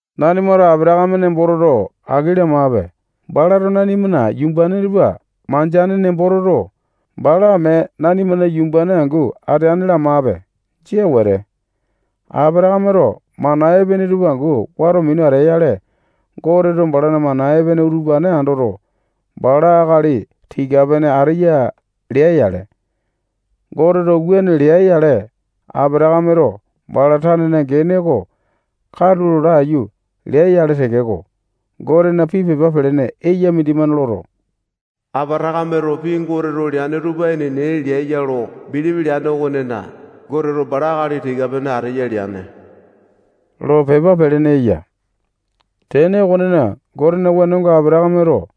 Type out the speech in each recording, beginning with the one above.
Nanimato Apatakame nembo toto, aki lamape. Balato nanimana yumbane tupa mandeane nembo toto, bala mee nanimana yumbane angu ateane lamape. Jia wete. Apatakameto mana epene tupa angu wato minu atea-yale, Goteto balana mana epene utupane andoto, bala akali tika-pene ateya lea-yale. Goteto wuane lea-yale, Apatakameto bala tanena gene oko katulo laiyu lea-yale tekeko, Gotena pii pepa pelene eya mindimane loto, Apatakameto pii Goteto leane tupa enene lea ya lo bilipi leane okonena, Goteto bala akali tika-pene ateya leane lo pepa pelene eya. Tene okonena, Gotena wenonga Apatakameto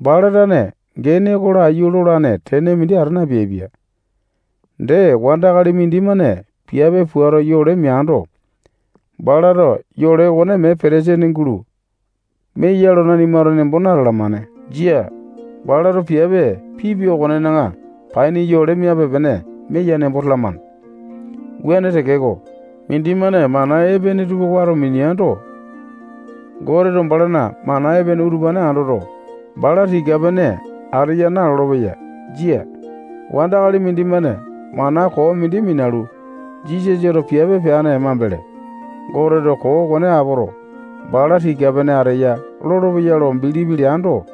bala tane gene oko laiyu lolane tene mindi ata napeaipia. Dee, wandakali mindimane piape puato yole meando, balato yole okone mee petesene gulo meya lo nanimato nembo natalamane. Jia. Balato piape pipia okonena paini yole miape-pene meya nembo talamane. Wuane tekeko, mindimane mana epene tupa wato mineando, Goteto balana mana epene utupane andoto, bala tika-pene ateya nalolo-peya. Jia. Wandakali mindimane mana koo mindi minalu, Jisasato piape peane mambele, Goteto koo okone apoto, bala tika-pene ateya lolopeya lo bilipi leando,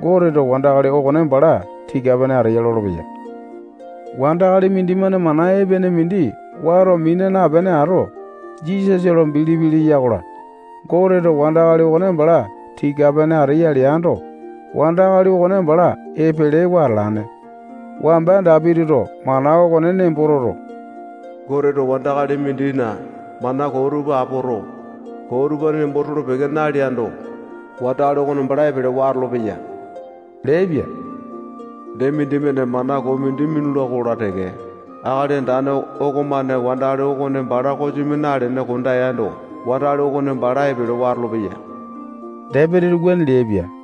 Goteto wandakali okone bala tika-pene ateya lolopeya. Wandakali mindimane mana epene mindi wato mina napene ato, Jisasa lo bilipi leya-kola, Goteto wandakali okone bala tika-pene ateya leando, wandakali okone bala epelewa atalane. Wamba Dapitito mana okone nembo toto, Goteto wandakali mindina mana koo tupa apoto, koo utupane nembo tolo-peke naleando, wandakali okone bala epelewa atolopeya leaipia. Dee, mindimane mana koo mindi minula-kola teke, Akali Andane okomane wandakali okone bala kosimi nalene kondeando, wandakali okone bala epelewa atolopeya. Dapitito wuane leaipia.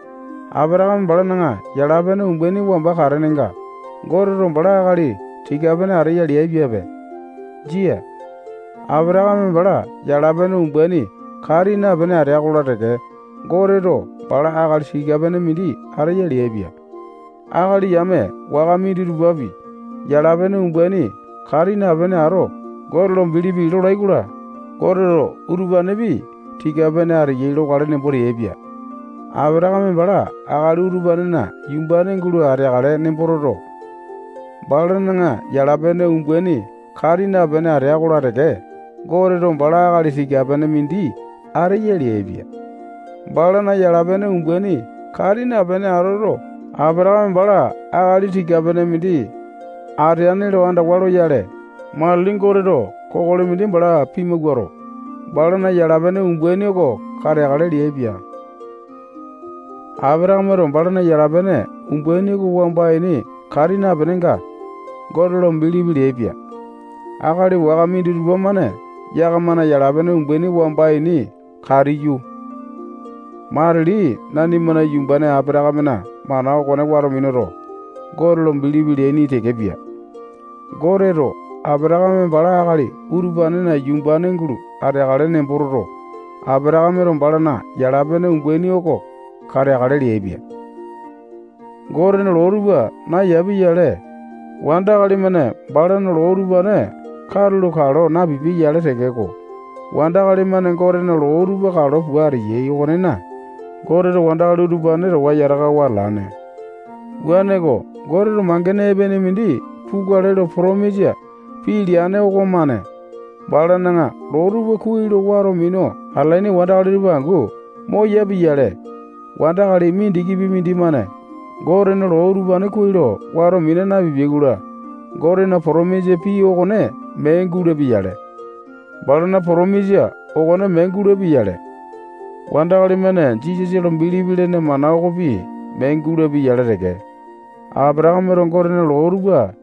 Apatakame balana yala-pene umbaini wamba katenenga Goteto bala akali tika-pene ateya leaipiape. Jia. Apatakame bala yala-pene umbaini kati napene atea-kola teke, Goteto bala akali tika-pene mindi ateya leaipia. Akali yame waka minditupapi yala-pene umbaini kati napene ato, Gote lo bilipi lolai-kola, Goteto utupanepi tika-pene ateyai lokale nembo teaipia. Apatakame bala akali utupanena yumbane gulo ateakale nembo toto, balana yala-pene umbaini kati napene atea-kola teke, Goteto bala akali tika-pene mindi ateya leaipia. Balana yala-pene umbaini kati napene atoto, Apatakame bala akali tika-pene mindi ateane lo andawa loyale, matili Goteto kokoli mindi bala pimawuato, balana yala-pene umbaini oko kateakale leaipia. Apatakameto balana yala-pene umbaini oko wamba ini kati napenenga, Gote lo bilipi leaipia. Akali waka minditupa-mane yakamana yala-pene umbaini wamba ini katiyu, matili nanimana yumbane Apatakamena mana okone wato minuto, Gote lo bilipi leaini tekepia. Goteto Apatakame bala akali utupanena yumbane gulo ateakale nembo toto, Apatakameto balana yala-pene umbaini oko kateakale leaipia. Gotena loo tupa nayapia-yale, wandakali-mane balana loo utupane katulo kalo napipia-yale tekeko, wandakali-mane Gotena loo tupa kalo pua ateyai okonena, Goteto wandakali utupane towa yatakawa atalane. Wuaneko, Goteto mangene epene mindi pukale lo potomisa pii leane okomane balana loo tupa kuai lo wato minu atalaini wandakali tupa angu moyapia-yale, wandakali mindikipi mindimane Gotena loo utupane kuai lo wato mina napipiai-kola, Gotena potomisa pii okone mee gulapia yale. Balana potomisa okone mee gulapia-yale, wandakali-mane Jisasa lo bilipi lene mana okopi mee gulapia-yale teke. Apatakameto Gotena loo tupa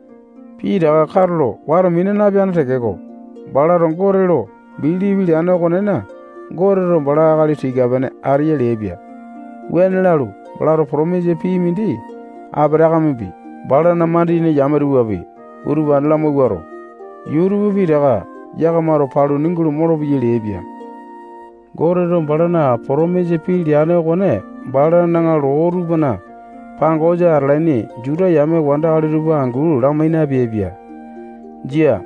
pitaka katulo wato mina napeane tekeko, balato Gote lo bilipi leane okonena, Goteto bala akali tika-pene ateya leaipia. Wuane lalu, balato potomisa pii mindi Apatakamepi, balana mandiyene yame tupapi, utupane lamawuato, yuu tupa pitaka yakamato paluni gulo molopeyai leaipia. Goteto balana potomisa pii leane okone balana loo tupana pangosa atalaini Juta yame wandakali tupa angu lamai napeaipia. Jia.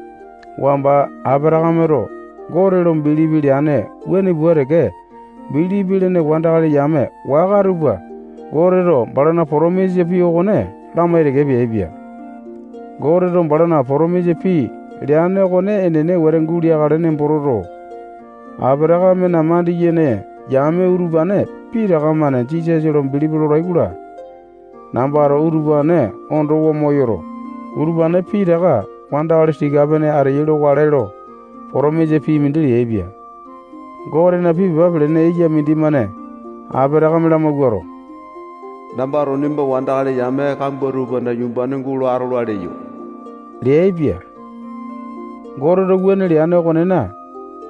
Wamba Apatakameto Gote lo bilipi leane wuane pua teke bilipi lene wandakali yame waka tupa Goteto balana potomisa pii okone lamai teke peaipia. Goteto balana potomisa pii leane okone enene wete guleakale nembo toto, Apatakamena mandiyene yame utupane pitaka-mane Jisasa lo bilipi lolai-kola, nambato utupane ondowa moyoto, utupane pitaka wandakali tika-pene ateyai lokale lo potomisa pii mindi leaipia. Gotena pii pepa pelene eya mindimane Apatakame lamawuato, nambato nimba wandakali yame kambua tupana yumbane gulo atola leyo leaipia. Goteto wuane leane okonena,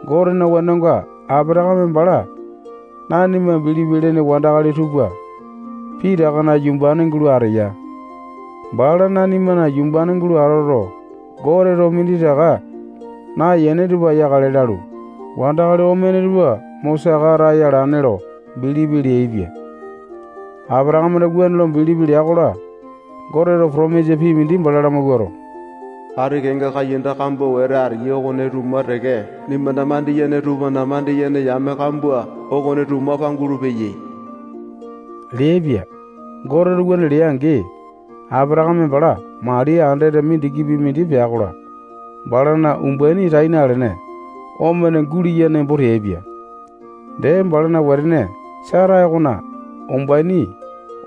Gotena wenonga, Apatakame bala nanima bilipi lene wandakali tupa pitakana yumbane gulo ateya. Bala nanimana yumbane gulo atoto, Goteto minditaka nayane tupa yakale lalu, wandakali omene tupa mo saka ataya alane lo bilipi leaipia. Apatakameto wuane lo bilipi lea-kola, Goteto potomisa pii mindi bala lamawuato, ati kenga kaiyanda kambua wete ateyai okone tuma teke nimbana mandiyene tupana mandiyene yame kambua okone tuma pangulu-peyai leaipia. Goteto wuane lea-angi, Apatakame bala mali andete mindikipi mindi pea-kola, balana umbaini tai nalene, omene guleya nembo teaipia. Dee, balana wetene Sata okona umbaini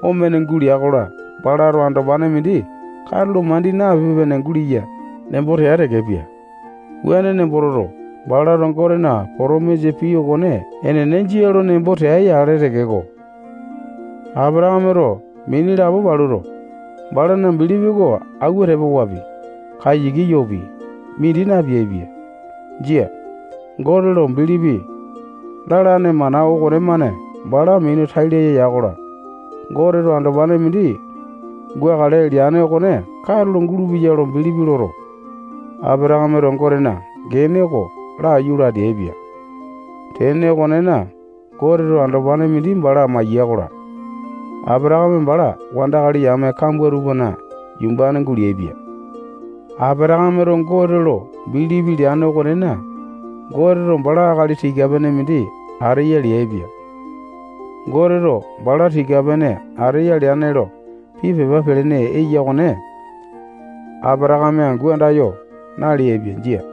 omene gulea-kola, balato andopane mindi katulo mandi napipe-pene guleya nembo tea tekepia. Wuane nembo toto, balato Gotena potomisa pii okone enene jia lo nembo tea-yale tekeko, Apatakameto mini lapo paluto, balana bilipi oko auwa tepa wapi, kayiki yopi, mindi napeaipia. Jia. Gote lo bilipi lalane mana okonemane bala minu tai laya ya-kola, Goteto andopane mindi gukale leane okone katulo gulupeya lo bilipi loto, Apatakameto Gotena gene oko laiyu lo ateaipia. Tene okonena, Goteto andopane mindi bala maiya-kola, Apatakame bala wandakali yame kambua tupana yumbane guleaipia. Apatakameto Gote lo bilipi leane okonena, Goteto bala akali tika-pene mindi ateya leaipia. Goteto bala tika-pene ateya leane lo pii pepa pelene eya okone Apatakame angu andayo naleaipia. Jia.